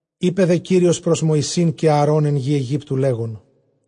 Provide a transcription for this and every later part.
Εἶπε δὲ Κύριος πρὸς Μευσῆν καὶ Ἀαρὼν ἐν γῇ Αἰγύπτου, λέγων,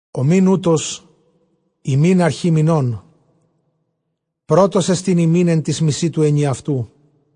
ὁ μὴν οὗτος ὑμῖν ἀρχὴ μηνῶν· πρῶτός ἐστιν ὑμῖν ἐν τοῖς μησὶ τοῦ ἐνιαυτοῦ.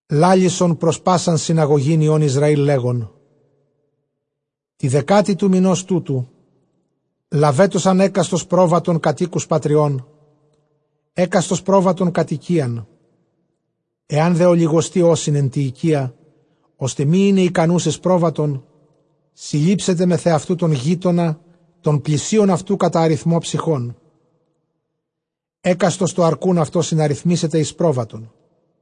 Λάλησον πρὸς πᾶσαν συναγωγὴν υἱῶν Ἰσραὴλ, λέγων, τῇ δεκάτῃ τοῦ μηνὸς τούτου λαβέτωσαν ἕκαστος πρόβατον κατʼ οἴκους πατριῶν, ἕκαστος πρόβατον κατʼ οἰκίαν. Ἐὰν δὲ ὀλιγοστοὶ ὦσιν ἐν τῇ οἰκίᾳ, ὥστε μὴ εἶναι ἱκανοὺς εἰς πρόβατον, συλλήψεται μεθʼ ἑαυτοῦ τὸν γείτονα τὸν πλησίον αὐτοῦ· κατὰ ἀριθμὸν ψυχῶν, ἕκαστος τὸ ἀρκοῦν αὐτῷ συναριθμήσεται εἰς πρόβατον.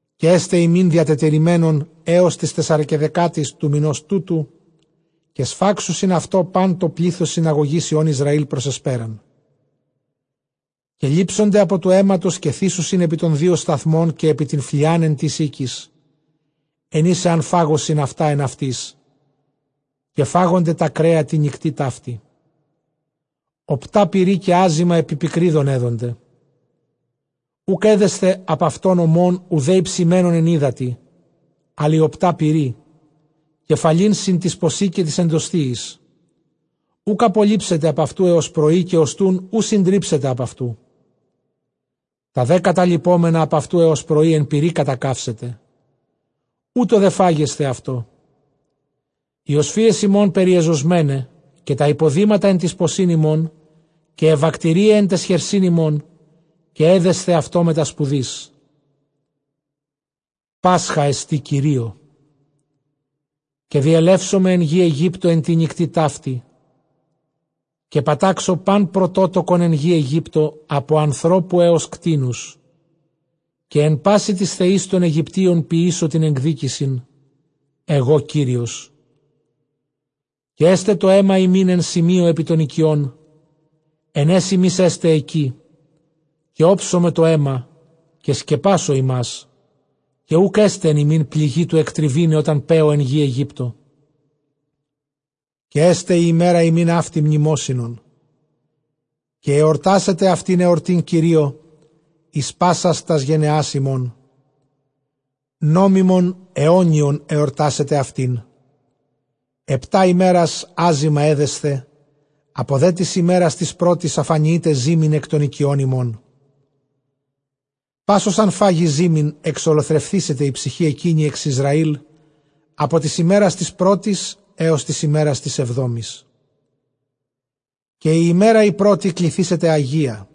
Καὶ ἔσται ὑμῖν διατετηρημένον ἕως τῆς τεσσαρεσκαιδεκάτης τοῦ μηνὸς τούτου· καὶ σφάξουσιν αὐτὸ πᾶν τὸ πλῆθος συναγωγῆς υἱῶν Ἰσραὴλ πρὸς ἑσπέραν. Καὶ λήψονται ἀπὸ τοῦ αἵματος, καὶ θήσουσιν ἐπὶ τῶν δύο σταθμῶν καὶ ἐπὶ τὴν φλιὰν, ἐν τοῖς οἴκοις ἐν οἷς ἐὰν φάγωσιν αὐτὰ ἐν αὐτοῖς. Καὶ φάγονται τὰ κρέα τῇ νυκτὶ ταύτῃ ὀπτὰ πυρὶ, καὶ ἄζυμα ἐπὶ πικρίδων ἔδονται. Οὐκ ἔδεσθε ἀπʼ αὐτῶν ὠμὸν, οὐδὲ ἡψημένον ἐν ὕδατι, ἀλλʼ ἢ ὀπτὰ πυρὶ, κεφαλὴν σὺν τοῖς ποσὶ καὶ τοῖς ἐνδοσθίοις. Οὐκ ἀπολείψεται ἀπʼ αὐτοῦ ἕως πρωΐ· καὶ ὀστοῦν οὐ συντρίψετε ἀπʼ αὐτοῦ· τὰ δὲ καταλειπόμενα ἀπʼ αὐτοῦ ἕως πρωῒ ἐν πυρὶ κατακαύσετε. Οὕτω δὲ φάγεσθε αὐτό· αἱ ὀσφύες ὑμῶν περιεζωσμέναι, καὶ τὰ ὑποδήματα ἐν τοῖς ποσὶν ὑμῶν, καὶ αἱ βακτηρίαι ἐν ταῖς χερσὶν ὑμῶν· καὶ ἔδεσθε αὐτὸ μετὰ σπουδῆς· Πάσχα ἐστὶ Κυρίῳ. Καὶ διελεύσομαι ἐν γῇ Αἰγύπτῳ ἐν τῇ νυκτὶ ταύτῃ, καὶ πατάξω πᾶν πρωτότοκον ἐν γῇ Αἰγύπτῳ ἀπὸ ἀνθρώπου ἕως κτήνους· καὶ ἐν πᾶσι τοῖς θεοῖς τῶν Αἰγυπτίων ποιήσω τὴν ἐκδίκησιν· ἐγὼ Κύριος. Καὶ ἔσται τὸ αἷμα ὑμῖν ἐν σημείῳ ἐπὶ τῶν οἰκιῶν, ἐν αἷς ὑμεῖς ἔστε ἐκεῖ· καὶ ὄψομαι τὸ αἷμα, καὶ σκεπάσω ὑμᾶς, καὶ οὐκ ἔσται ἐν ὑμῖν πληγὴ τοῦ ἐκτριβῆναι ὅταν παίω ἐν γῇ Αἰγύπτῳ. Καὶ ἔσται ἡ ἡμέρα ὑμῖν αὕτη μνημόσυνον, καὶ ἑορτάσετε αὐτὴν ἑορτὴν Κυρίῳ εἰς πάσας τὰς γενεὰς ὑμῶν· νόμιμον αἰώνιον ἑορτάσετε αὐτήν. Ἑπτὰ ἡμέρας ἄζυμα ἔδεσθε· ἀπὸ δὲ τῆς ἡμέρας τῆς πρώτης, ἀφανιεῖτε ζύμην ἐκ τῶν οἰκιῶν ὑμῶν· πᾶς ὃς ἂν φάγῃ ζύμην, ἐξολοθρευθήσεται ἡ ψυχὴ ἐκείνη ἐξ Ἰσραήλ, ἀπὸ τῆς ἡμέρας τῆς πρώτης ἕως τῆς ἡμέρας τῆς ἑβδόμης. Καὶ ἡ ἡμέρα ἡ πρώτη, κληθήσεται ἁγία·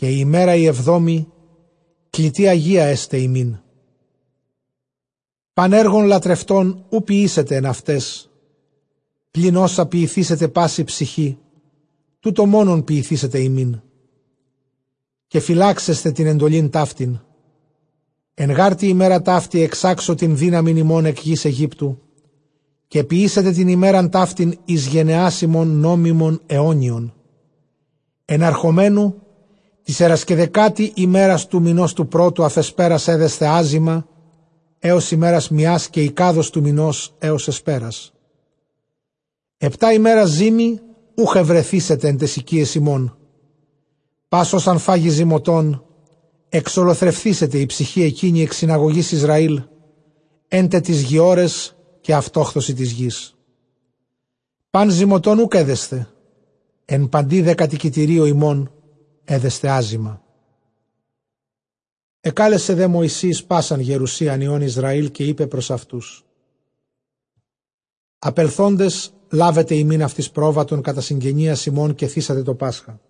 καὶ ἡ ἡμέρα ἡ ἑβδόμη, κλητὴ ἁγία ἔσται ὑμῖν· πᾶν ἔργον λατρευτὸν οὐ ποιήσετε ἐν αὐταῖς, πλὴν ὅσα ποιηθήσεται πάσῃ ψυχῇ, τοῦτο μόνον ποιηθήσεται ὑμῖν. Καὶ φυλάξετε τὴν ἐντολὴν ταύτην· ἐν γὰρ τῇ ἡμέρᾳ ταύτῃ ἐξάξω τὴν δύναμιν ὑμῶν ἐκ γῆς Αἰγύπτου, καὶ ποιήσετε τὴν ἡμέραν ταύτην εἰς γενεὰς ὑμῶν νόμιμον αἰώνιον, ἐναρχόμενοι τῇ τεσσαρεσκαιδεκάτῃ ἡμέρᾳ τοῦ μηνὸς τοῦ πρώτου, ἀφʼ ἑσπέρας ἔδεσθε ἄζυμα, ἕως ἡμέρας μίας καὶ εἰκάδος τοῦ μηνὸς, ἕως ἑσπέρας. Ἑπτὰ ἡμέρας ζύμη οὐχ εὑρεθήσεται ἐν ταῖς οἰκιαῖς ὑμῶν· πᾶς ὃς ἂν φάγῃ ζυμωτὸν, ἐξολοθρευθήσεται ἡ ψυχὴ ἐκείνη ἐκ συναγωγῆς Ἰσραήλ· ἔν τε τοῖς γειώραις, καὶ αὐτόχθοσι τῆς γῆς. Πᾶν ζυμωτὸν οὐκ ἔδεσθε, ἐν παντὶ δὲ κατοικητηρίῳ ὑμῶν ἔδεσθε ἄζυμα. Ἐκάλεσε δὲ Μωυσῆς πᾶσαν γερουσίαν υἱῶν Ἰσραὴλ, καὶ εἶπε πρὸς αὐτοὺς, ἀπελθόντες λάβετε ὑμῖν αὐτοῖς πρόβατον κατὰ συγγενείας ὑμῶν, καὶ θύσατε τὸ πάσχα.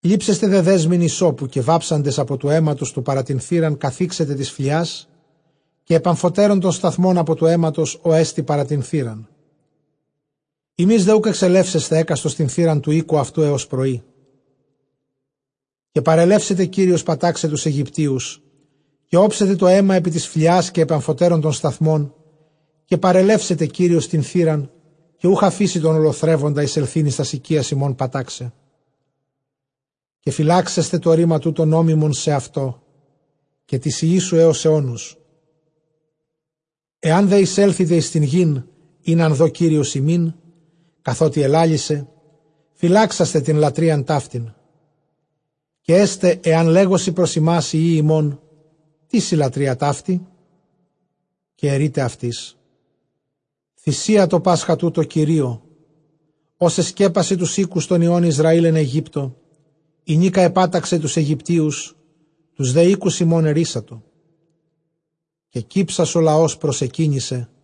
Λήψεσθε δὲ δέσμην ὑσσώπου, καὶ βάψαντες ἀπὸ τοῦ αἵματος τοῦ παρὰ τὴν θύραν, καθίξετε τῆς φλιᾶς, καὶ ἐπʼ ἀμφοτέρων τῶν σταθμῶν, ἀπὸ τοῦ αἵματος ὅ ἐστι παρὰ τὴν θύραν· ὑμεῖς δὲ οὐκ ἐξελεύσεσθε ἕκαστος τὴν θύραν τοῦ οἴκου αὐτοῦ ἕως πρωΐ. Καὶ παρελεύσεται Κύριος πατάξαι τοὺς Αἰγυπτίους, καὶ ὄψεται τὸ αἷμα ἐπὶ τῆς φλιᾶς, καὶ ἐπʼ ἀμφοτέρων τῶν σταθμῶν· καὶ παρελεύσεται Κύριος τὴν θύραν, καὶ οὐκ ἀφήσει τὸν ὀλοθρεύοντα εἰσελθεῖν εἰς τὰς οἰκίας ὑμῶν πατάξαι. Καὶ φυλάξασθε τὸ ῥῆμα τοῦτο νόμιμον σεαυτῷ, καὶ τοῖς υἱοῖς σου, ἕως αἰῶνος. Ἐὰν δὲ εἰσέλθητε εἰς τὴν γῆν, ἣν ἂν δῷ Κύριος ὑμῖν, καθότι ἐλάλησε, φυλάξασθε τὴν λατρείαν ταύτην. Καὶ ἐσται ἐὰν λέγωσι πρὸς ὑμᾶς οἱ υἱοὶ ὑμῶν, τίς ἡ λατρεία αὕτη; Καὶ ἐρεῖτε αὐτοῖς, θυσία τὸ πάσχα τοῦτο Κυρίῳ, ὡς ἐσκέπασε τοὺς οἴκους τῶν υἱῶν Ἰσραὴλ ἐν Αἰγύπτῳ, ἡνίκα ἐπάταξε τοὺς Αἰγυπτίους, τοὺς δὲ οἴκους ἡμῶν ἐῤῥύσατο· καὶ κύψας ὁ λαὸς προσεκύνησε.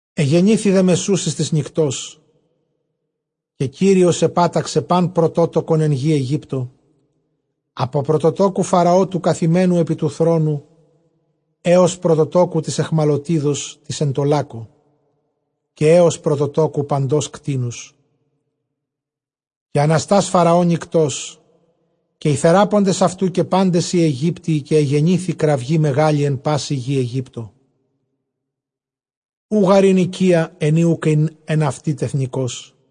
Ἐγενήθη δὲ μεσούσης τῆς νυκτὸς, καὶ Κύριος ἐπάταξε πᾶν πρωτότοκον ἐν γῇ Αἰγύπτῳ, ἀπὸ πρωτοτόκου Φαραὼ τοῦ καθημένου ἐπὶ τοῦ θρόνου, ἕως πρωτοτόκου τῆς αἰχμαλωτίδος τῆς ἐν τῷ λάκκῳ, καὶ ἕως πρωτοτόκου παντὸς κτήνους. Καὶ ἀναστὰς Φαραὼ νυκτὸς, καὶ οἱ θεράποντες αὐτοῦ, καὶ πάντες οἱ Αἰγύπτιοι, καὶ ἔγενήθη κραυγὴ μεγάλη ἐν πάσῃ γῇ Αἰγύπτῳ· οὐ γὰρ ἦν οἰκία, ἐν ᾗ οὐκ ἦν ἐν αὐτῇ τεθνηκώς.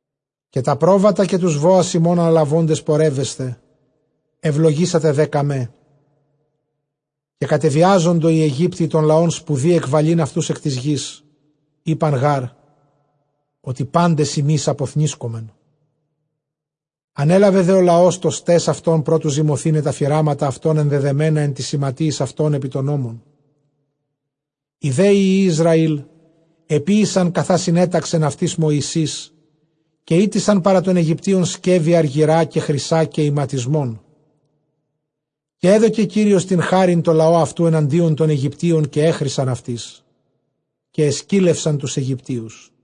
Καὶ τὰ πρόβατα καὶ τοὺς βόας ὑμῶν ἀναλαβόντες πορεύεσθε· εὐλογήσατε δὴ κᾀμέ. Καὶ κατεβιάζοντο οἱ Αἰγύπτιοι τὸν λαὸν σπουδῇ ἐκβαλεῖν αὐτοὺς ἐν τῆς γῆς· εἶπαν γὰρ, ὅτι πάντες ἡμεῖς ἀποθνήσκομεν. Ἀνέλαβε δὲ ὁ λαὸς τὸ σταῖς αὐτῶν, πρὸ τοῦ ζυμωθῆναι τὰ φυράματα αὐτῶν, ἐνδεδεμένα ἐν τοῖς ἱματίοις αὐτῶν ἐπὶ τῶν ὤμαν. Οἱ δὲ υἱοὶ Ἰσραὴλ ἐποίησαν, καθὰ συνέταξεν αὐτοῖς Μωυσῆς, καὶ ᾔτησαν παρὰ τῶν Αἰγυπτίων σκεύη ἀργυρᾶ καὶ χρυσᾶ καὶ ἱματισμόν. Καὶ ἔδωκε Κύριος τὴν χάριν τῷ λαῷ αὐτοῦ ἐναντίον τῶν Αἰγυπτίων, καὶ ἔχρησαν αὐτοῖς· καὶ ἐσκύλευσαν τοὺς Αἰγυπτίους.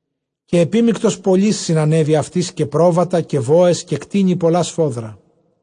Καὶ ἐπίμικτος πολὺς συνανέβη αὐτοῖς, καὶ πρόβατα, καὶ βόες, καὶ κτήνη πολλὰ σφόδρα.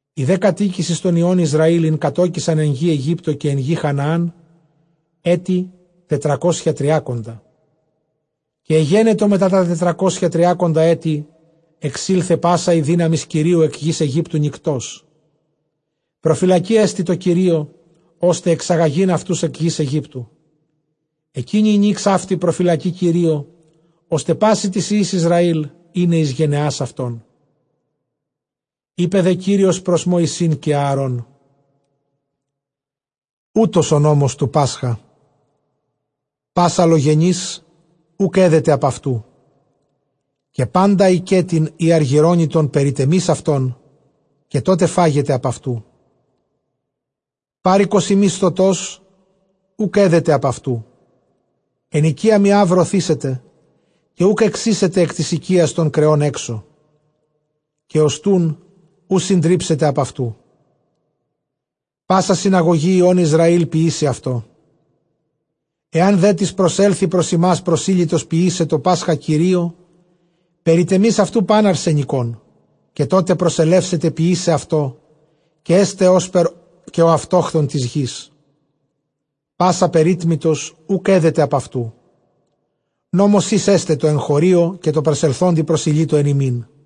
Ἡ δὲ κατοίκησις τῶν υἱῶν Ἰσραὴλ, ἣν κατῴκησαν ἐν γῇ Αἰγύπτῳ καὶ ἐν γῇ Χαναὰν, ἔτη τετρακόσια τριάκοντα. Καὶ ἐγένετο μετὰ τὰ τετρακόσια τριάκοντα ἔτη, ἐξῆλθε πᾶσα ἡ δύναμις Κυρίου ἐκ γῆς Αἰγύπτου νυκτός. Προφυλακή ἐστι τῷ Κυρίῳ, ὥστε ἐξαγαγεῖν αὐτοὺς ἐκ γῆς Αἰγύπτου· ἐκείνη ἡ νὺξ αὕτη, προφυλακὴ Κυρίῳ, ὥστε πᾶσι τοῖς υἱοῖς Ἰσραὴλ εἶναι εἰς γενεὰς αὐτῶν. Εἶπε δὲ Κύριος πρὸς Μωυσῆν καὶ Ἀαρὼν, οὗτος ὁ νόμος τοῦ πάσχα· πᾶς ἀλλογενὴς οὐκ ἔδεται ἀπʼ αὐτοῦ· Καὶ πάντα οἰκέτην ἢ ἀργυρώνητον περιτεμεῖς αὐτόν· καὶ τότε φάγεται ἀπʼ αὐτοῦ. Πάροικος ἢ μισθωτὸς οὐκ ἔδεται ἀπʼ αὐτοῦ. Ἐν οἰκίᾳ μιᾷ βρωθήσεται, καὶ οὐκ ἐξοίσετε ἐκ τῆς οἰκίας τῶν κρεῶν ἔξω· καὶ ὀστοῦν οὐ συντρίψετε ἀπʼ αὐτοῦ. Πᾶσα συναγωγὴ υἱῶν Ἰσραὴλ ποιήσει αὐτό. Ἐὰν δέ τις προσέλθῃ πρὸς ὑμᾶς προσήλυτος ποιῆσαι τὸ πάσχα Κυρίῳ, περιτεμεῖς αὐτοῦ πᾶν ἀρσενικόν, καὶ τότε προσελεύσεται ποιῆσαι αὐτό· καὶ ἔσται ὥσπερ καὶ ὁ αὐτόχθων τῆς γῆς· πᾶς ἀπερίτμητος οὐκ ἔδεται ἀπʼ αὐτοῦ. Νόμος εἷς ἔσται τῷ ἐγχωρίῳ, καὶ τῷ προσελθόντι προσηλύτῳ ἐν ὑμῖν.